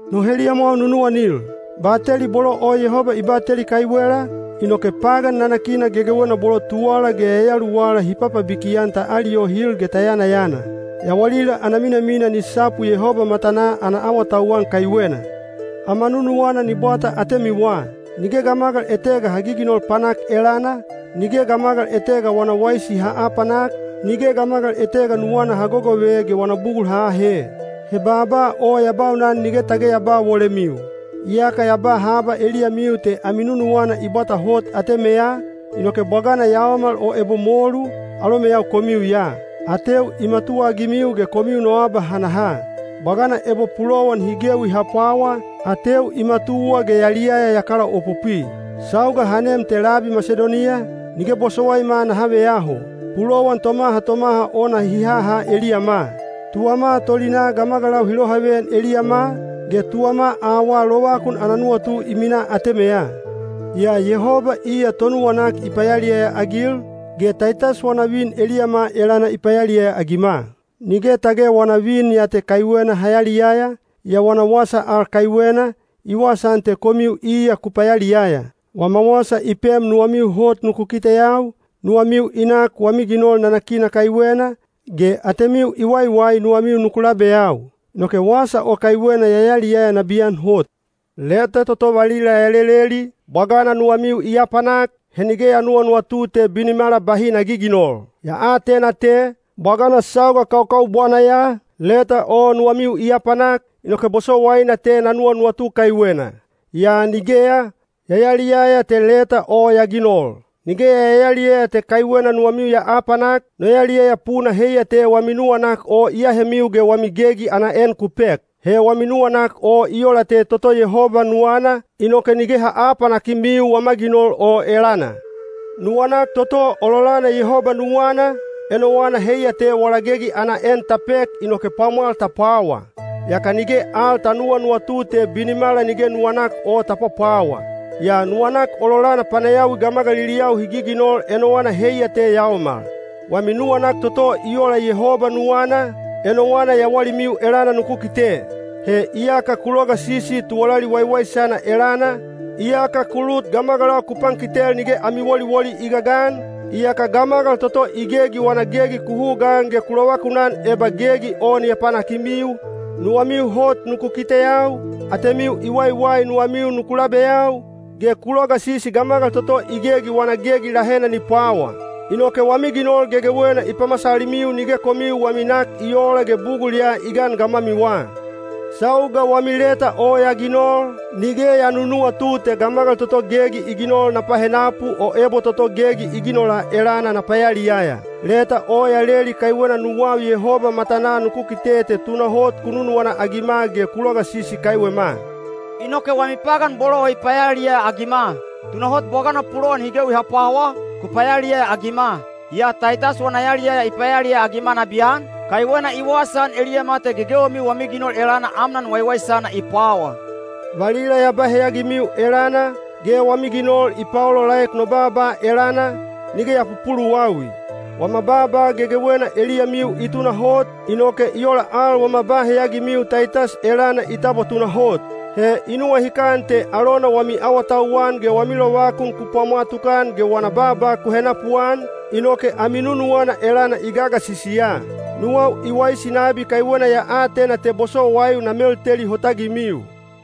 No heliyamwau nunuwanil, bateli bolo o Yehoba i bateli kaiwela, inoke pagan nanakina gegewena bolo tuwala ge yayaluwala hi papabiki-an ta aliyohil ge ta yanayana. Yawalila ana minamina ni sapu Yehoba matanaa ana awatauwan kaiwena. Ama nunuwana ni bwata atemiwa. Nige gamagal etega ha giginol panak elana, nige gamagal etega wana waisi ha aapanak, nige gamagal etega nuwana ha gogove ge wana bugul ha aahe. He baaba o ya baunan nige tage ya ba wolemiu. Iyaka ya ba haba eliyamiu te ami nunuwana i bwata hot atemeya, inoke bwagana yaomal o ebo molu, alomeyau komiu ya. Ateu i matuwaagimiu ge komiu no abahanaha. Bwagana ebo pulowan hi gewi ha pwawa, ateu i matuwa ge yaliyaya ya kalaopopwi. Sauga ha nem te labi Masidoniya, nige bosowaima naha veyaho. Pulowan tomaha tomaha ona hi haha eliyama. Tuwama tolinaa gamagalau hi lohaveyan eliyama, ge tuwama awaa lovakun ana nuwatu i minaa atemeya. Yaa Yehoba iya tonuwanak i payaliyaya-agil, ge Taitas wana vin eliyama elana i payaliyaya-agima. Nige tage wana vin ya te kaiwena ha yaliyaya, yaa wana wasa al kaiwena, i wasaan te komiu iya ku payaliyaya. Wama wasa i pem nuwamiu hot nuku kiteyau, nuwamiu i nak wami ginol nanakina kaiwena, ge atemiu i waiwai nuwamiu nuku labeyau. Inoke wasa o kaiwena ya yaliyaya nabiyan hot. Leta toto valila ya leleli, bwagana nuwamiu i apanak, he nige ya nuwanuwatu te binimala bahi na giginol. Ya atena te, bwagana sauga kaukaubwana ya, leta o nuwamiu i apanak, inoke bosowaina te na nuwanuwatu kaiwena. Yaa nigeya, ya yaliyaya te leta o ya ginol. Nige ya yaliyaya te kaiwena nuwamiu ya apanak, no yaliyaya puna heiya te wami nuwanak o i ahemiu ge wami gegi ana en ku pek. He wami nuwanak o i ola te toto Yehoba nuwana, inoke nige ha aapanakimiu wama ginol o elana. Nuwanak toto ololana Yehoba nuwana, enowana heiya te wala gegi ana en ta pek inoke pwamwal ta pwawa. Yaka nige al ta nuwanuwatu te binimala nige nuwanak o ta pwapwawa. Yaa nuwanak ololana panayawi gamagaliliyau hi giginol enowana heiya te yaomal. Wami nuwanak toto i ola Yehoba nuwana, enowana yawalimiu elana nuku kite. He iyaka ku logasisi tuwalali waiwaisana elana, iyaka ku lut gamagalau ku pankitel nige ami woliwoli i gagan, iyaka gamagal toto i gegi wana gegi ku hugaan ge ku lovakun eba gegi o ni apanakimiu, nuwamiu hot nuku kiteyau, atemiu i waiwai nuwamiu nuku labeyau, ge ku logasisi gamagal toto i gegi wana gegi lahena ni pwawa. Inoke wami ginol gegewena i pamasalimiu nige komiu wami nak i oola ge bugul ya i gan gamwamiwa. Sauga wami leta o ya ginol, nige ya nunuwatu te gamagal toto gegi i ginol na pahenapu o ebo toto gegi i ginola elana na payaliyaya. Leta o ya leli kaiwena nuwau Yehoba matanaa nuku kite te tunahot ku nunuwana-agima ge ku logasisi kaiwema. Inoke wami pagan bolo o i payaliyaya-agima. Tunahot bwagana pulowan hi gewi ha pwawa, ku payaliyaya-agima. Yaa Taitas wana yaliyaya i payaliyaya-agima nabiyan, kaiwena i wasaan eliyama te gegewemiu wami ginol elana amnan waiwaisana i pwawa. Valila ya ba heyagimiu elana, ge wami ginol i paolaolaek no baaba elana, nige ya pupuluwawi. Wama baaba gegewena eliyamiu i tunahot, inoke i ola al wama ba heyagimiu Taitas elana i tabwa tunahot. He i nuwahikan te alona wami awatauwan ge wami lovakun ku pwamwa tukan ge wana baaba ku henapuan, inoke ami nunuwana elana i gagasisi ya. Nuwau i waisi nabi kaiwena ya atena te bosowaiu na melteli hotagimiu.